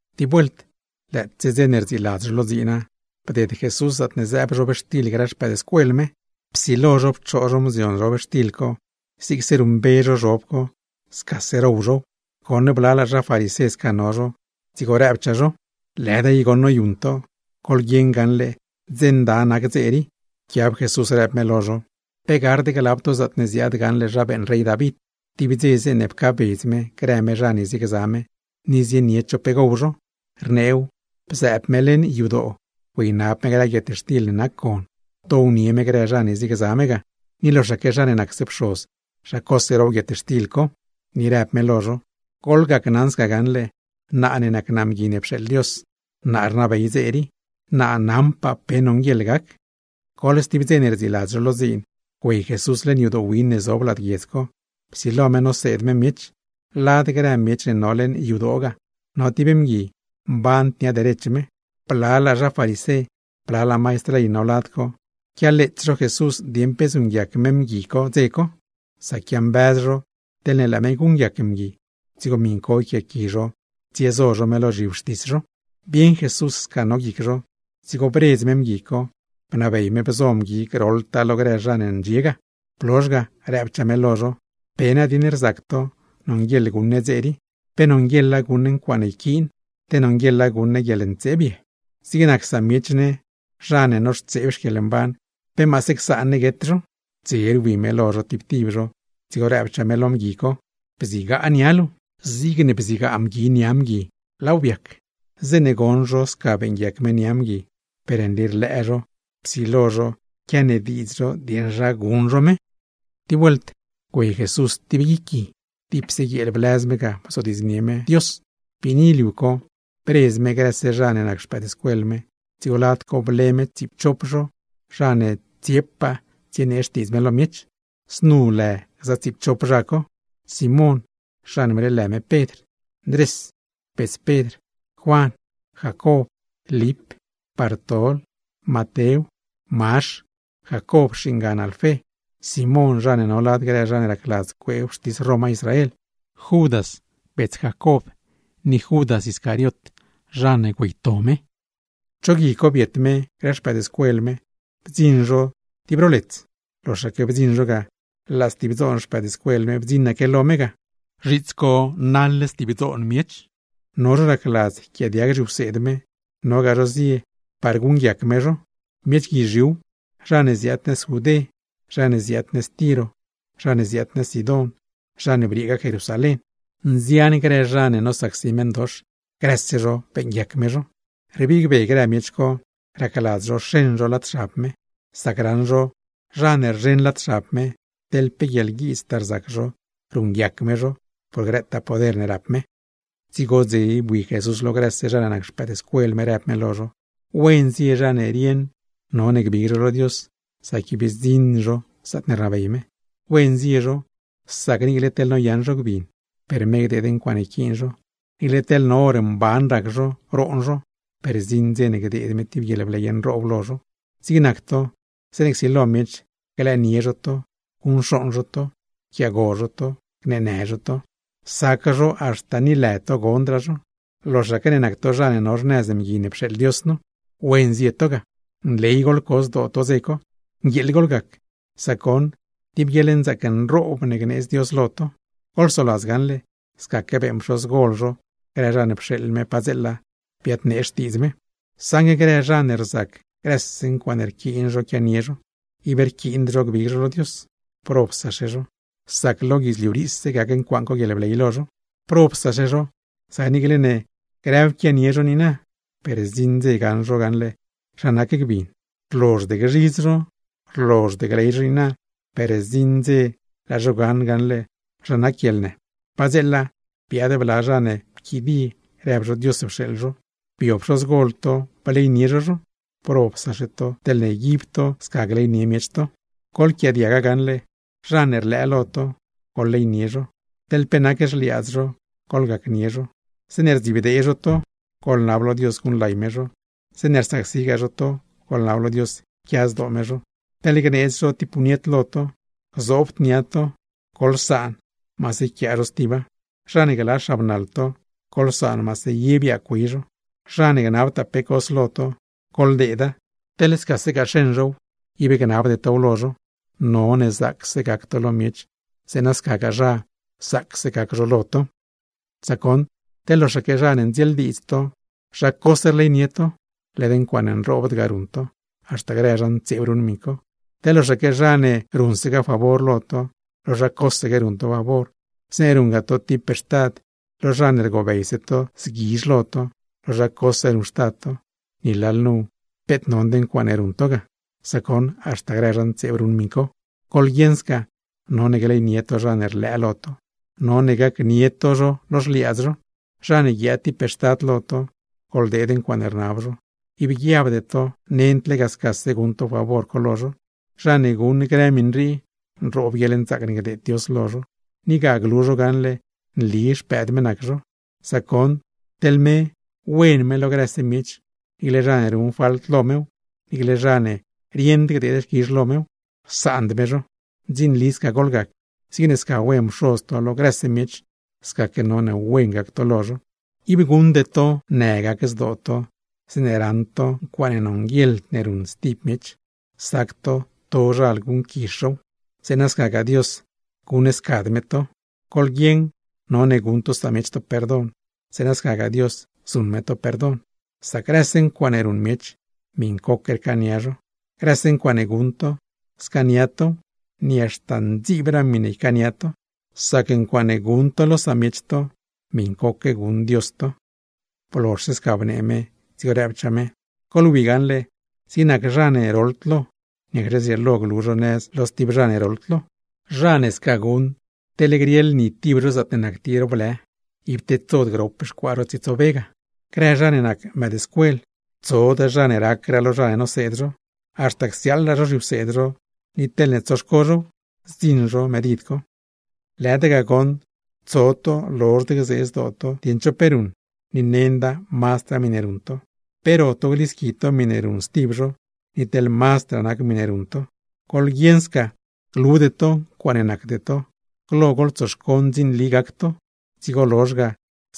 Tib vuelt, lëëtse dze ne rdziiladz zho lo dziina, bded Jesús zaatne zëëb zhobxtil grë xpëëdscuel me; psilo zho pchoo zho mzion zhobxtil co, zigse ruṉmbe zho zhob co, scase row zhow. Goṉ blalaa zha farisé sca no zho, dzigo rëbchaa zho: ―¡Lëda i goṉ noyuṉ to! Goḻguieṉ gaṉle dze nda nac dze rii. Pquiab Jesús rëb me lo zho: ―¿Pe gard glab to zaatne ziaad gaṉle zha beeṉ rey David, tib dze zeeṉe pcaabedz me grë me zha ne ziegza me, ni zienied zho pe gow zho? Rneew, bzëëb me leṉ yadoo güeynab me grë guietxtil ne nac gon, downie me grë zha ne ziegza me ga; ni loxaque zha ne nacse pxoz, zha cose row guietxtil co. Ni rëb me lo zho: ―Gacnaṉ to gaṉle naa ne nac naa Mgui ne pxeeḻ Dios, naa rnabey dze rii, naṉpaa naa pe nonguieḻ gac. Goḻ stib dze ne rdziiladz zho lo dziin, güey Jesús leṉ yadoo win ne zob lad guiedz co, psilo me noseed me miech. Lad grë miech ne no leṉ yadoo ga, no tib mgui, mband nia derech me. Blalaa zha farisé, blalaa maistr ley no lad co, quialeets zho Jesús dieṉ pe zuṉguiac me mgui co, dze co; sac quiambëz zho teḻ laa me guṉguiac mgui, dzigo miṉ co yquiaaqui zho tsiezo zho me lo zhiwxtis zho. Bieṉ Jesús sca no guic zho, dzigo bredz me mgui co, bnabey me bzo mgui groḻtaa lo grë zha ne ndxie ga; blozh ga rëbchaa me lo zho: ―¿Pe nadieṉ rzac to nonguieḻ guṉ ne dze rii? ¿Pe nonguieḻa guṉ ne ncuaaṉe yquiin, te nonguieḻa guṉ ne guieḻntseeb ye? Zig nac samiech ne zha ne noxtseeb xquieḻmban, ¿pe maase csaan ne guet zho? Dze rwi me lo zho tib tib zho, dzigo rëbchaa me lo mgui co: ―¡Bzigaa nia luu! Zigne bzigaa mgui co nia mgui, laaw biac. Zeeṉe goṉ zho sca beeṉguiac me nia mgui, per nli rlëë zho, psilo zho quianediidz zho dieṉ zha guṉ zho me. Tib vuelt, güey Jesús tib guic gui, dipse guieel blëz me ga bzodiidznie me Dios. Biini liu co, bredz me grëse zha ne nac xpëëdscuel me, dzigo lad co ble me tsiipchop zho, zha ne tsiepaa tsienee xtiidz me lo miech. Znu lë gza tsiipchop zha co: Simón (zha ne bleelë me Pedr), Ndrés (bets Pedr), Juan, Jacob, Lip, Bartol, Matew, Mazh, Jacob (xingan Alfé), Simón (zha ne no lad grë zha ne racladz cuee wxtis Roma Israel), Judas (bets Jacob), ni Judas Iscariot (zha ne güeyto me). Cho gui co biet me grë xpëëdscuel me, bdziṉ zho tib ro lets. Loxaque bdziṉ zho ga, laa stib dzoon xpëëdscuel me bdziṉaque lo me ga; zhiits co naḻ stib dzoon miech, no zho racladz yquiaadiag zhiwseed me, nogaa zho zie ga par guṉguiac me zho. Miech guizhiuw, zha ne ziaad nëz Judé, zha ne ziaad nëz Tiro, zha ne ziaad nëz Sidón, zha ne brieegaa Jerusalén. Nzian grë zha co nosacsi meṉdox, grëse zho beeṉguiac me zho. Rbig be grë miech co racladz zho xeṉ zho lad xab me, sac raṉ zho, zha ne rzheṉ lad xab me, teḻ pe guieḻguiidztaa rzac zho, ruṉguiac me zho por grëtaa poder ne rap me. Dzigo dze bui Jesús lo grëse zha ne nac xpëëdscuel me, rëb me lo zho: ―¡Wen zie zha ne rieṉ none gbig zho lo Dios, sac ib zdziṉ zho zaatne rnabey me! ’¡Wen zie zho! Sac niicle teḻne noyaṉ zho gbin, per me gdeed ncuaaṉe yquiin zho; niicle teḻ no hor mban rac zho roon zho; per zdziṉ dze ne gdeed me tib guieḻbley nroob lo zho. ’Zig nac to, zeeṉe csilo miech glëënie zho to, guṉcxooṉ zho to, yquiaago zho to, gneenë zho to, sac zho haxta ni lë to gondraa zho, loxaque ne nac to zha ne no xnëz Mgui ne pxeeḻ Dios nu, ¡wen zie to ga! ¡Nley goḻco zdoo to dze co, nguieeḻ goḻgac, sac goṉ tib guieḻnzaac nroob ne gneedz Dios lo to! Goḻsoladz gaṉle, scaque beeṉ pxozgol zho grë zha ne pxeeḻ me padzeela biadnee xtiidz me. ’Saṉgue grë zha ne rzac grëse ncuaaṉe rquiin zho quianie zho, ib rquiind zho gbig zho lo Dios, ¡probsaxe zho, sac lo guidzliu riise gac ncuaaṉ co guieḻbley lo zho! ’¡Probsaxe zho, sac niicle ne grëw quianie zho niina, per zdziṉ dze gaṉ zho gaṉle zha nac gbin; rlozhd gzhidz zho, rlozhd gley zho niina, per zdziṉ dze laa zho gaṉ gaṉle zha nac guieḻnë! ’Padzeela, biaad bla zha ne pquidie rëb zho Dios pxeeḻ zho, bio pxozgol to bleynie zho zho, ¡probsaxe to teḻne yguib to sca gleynie miech to! ’Goḻquiaadiaga gaṉle: Zha ne rlëë lo to, goḻleynie zho, teḻ pe nac xliaadz zho goḻgacnie zho. Zeeṉe rdzibdee zho to, goḻnab lo Dios guṉlay me zho; zeeṉe rsacsigaa zho to, goḻnab lo Dios yquia zdoo me zho. Teḻ gneedz zho tib puñet lo to, gzoobd nia to, goḻsaan zho maase yquiaa zho stiba. ’Zha ne gla xabnaḻ to, goḻsaan maase ye biaagw güey zho. Zha ne gnabtaa pe cos lo to, goḻdeeda; teḻ scasegaa xeṉ zhow, ib gnabde tow lo zho. None zaacse gac to lo miech, zeeṉa scagaa zha, zaacse gac zho lo to. ’Sac goṉ, teḻ loxaque zha ne ndzieeldiidz to, zha cose rleynie to, ¡led ncuaaṉ nroobd ga ruṉ to! Haxta grë zha ntseeb ruṉ miṉ co. Teḻ loxaque zha ne ruṉsegaa favor lo to, lo zha cosegue ruṉ to favor; zeeṉe ruṉgaa to tib pextad, lo zha ne rgobeyse to zguizh lo to, lo zha cose ruṉxtad to, ¡ni lalnu peet nond ncuaaṉe ruṉ to ga! Sac goṉ haxta grë zha ntseeb ruṉ miṉ co. ’Goḻguieṉ sca, none gleynie to zha ne rlëë lo to, none gacnie to zho lo xliaadz zho. Zha ne guiaad tib pextad lo to, goḻdeed ncuaaṉe rnab zho, ib guiabde to nend lega scase guṉ to favor co lo zho. Zha ne guṉ grë miṉ rii, nroob guieḻnzaac ne gdeed Dios lo zho, ni ga glu zho gaṉle nli xpëëd me nac zho; sac goṉ teḻ me wen me lo grëse miech, niicle zha ne ruṉ falt lo mew, niicle zha ne rieṉdgaa gdeed xquizh lo me, rsaand me zho. Ndzinli sca goḻgac, zigne sca wen Pxoz to lo grëse miech, scaque none wen gac to lo zho. ’Ib guṉde to në gac zdoo to, zeeṉe raṉ to ncuaaṉe nonguieḻd ne ruṉ stib miech, sac to tozhal guṉquizh zhow; zeeṉa scagaa Dios guṉscad me to. Goḻguieṉ none guṉ to samiech to perdon, zeeṉa scagaa Dios zuṉ me to perdon; sac grëse ncuaaṉe ruṉ miech, miṉcoque rcaania zho. Grëse ncuaaṉe guṉ to, scaania tow, ni haxta ndziibraa miṉe ycaania to. Sac ncuaaṉe guṉ to lo samiech to, miṉcoque guṉ Dios to. Blozh sca bnee me, dzigo rëbchaa me: ―Goḻwi gaṉle, zig nac zha ne roḻd lo, ¿niacxe zrieelo glu zho nëz lo stib zha ne roḻd lo? Zha ne sca guṉ, teḻ grieḻ ni tib zho zaatne nac tib ro blë, ib tedsod grop xcuaa zho tsietsobe ga. ’Grë zha ne nac mëëdscuel, tsod zha ne racraa lo zha ne noseed zho; haxta csiaaḻraa zho zhiwseed zho, ni teḻne tsoxco zhow, zdziṉ zho medid co. ’¡Lëda ga goṉ tso to lozhd gzee zdoo to dieṉ cho pe ruṉ, ni nenda mazdraa miṉe ruṉ to! ¿Pe ro to glisqui to miṉe ruṉ stib zho, ni teḻ mazdraa nac miṉe ruṉ to? ¡Goḻguieṉ sca glude to ncuaaṉe nacde to! ¡Glo goḻtsoxco ndzinli gac to, dzigo lozh ga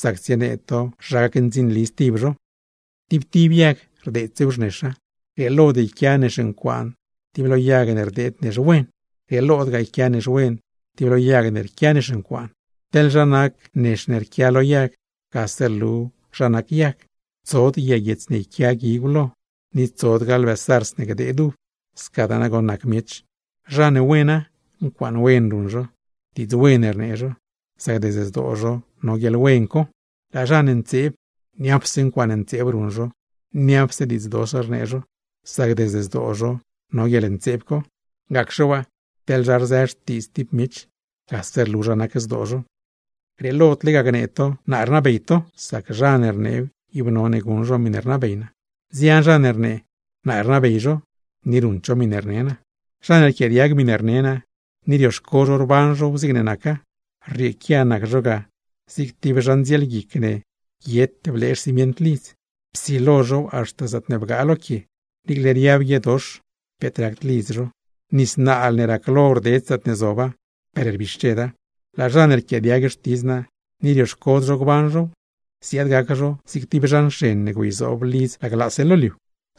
zac tsienee to zha gacndzinli stib zho! ’Tib tib yag rdeedsew xnexa. Grieelod yquia nex ncuaan tib lo yag ne rdeed nex wen; grieelodgaa yquia nex wen tib lo yag me rquia nex ncuaan. Teḻ zha nac nex ne rquia lo yag, gase rlu zha nac yag. Tsod yag guiets ne yquia guigw lo; ni tsodgaa lbë zarz ne gdeed uv. Scadaa nagoṉ nac miech, zha ne wena, ncuaaṉ wen ruṉ zho, diidz wen rnee zho, sac desde zdoo zho no guieḻwen co; laa zha ne ntseeb, niapse ncuaaṉe ntseeb ruṉ zho, niapse diidz dox rnee zho, sac desde zdoo zho no guieḻntseeb co. Gacxe waa, teḻ zha rzë xtiidz tib miech, gase rlu zha nac zdoo zho. ’Grieelod lega gnee to, naa rnabey to, sac zha ne rneew ib none guṉ zho miṉe rnabey naa. Nzian zha ne rnee, naa rnabey zho, ni ruṉd zho miṉe rne naa. ’Zha ne rquiaadiag miṉe rne naa, ni rioxco zho rban zhow zigne naca, rrieequia nac zho ga zig tib zha ndzielguic ne guiet blee xcimient lidz, psilo zhow haxta zaatne bgaa lo quie. Niicle riab guiedox, peet racd lidz zho, nis naal ne raclo rded zaatne zoba ga, per rbixcheda. Laa zha ne rquiaadiag xtidz naa, ni rioxcod zho gban zhow, ziaad gac zho zig tib zha nxen ne güeyzoob lidz laglaase lo liu.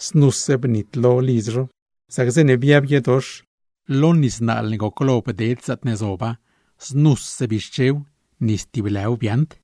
Znuse bnitlo lidz zho, sac zeeṉe biab guiedox, lo nis naal ne goclo bded zaatne zoba, znuse bixchew, ni stib lëw biaaṉd.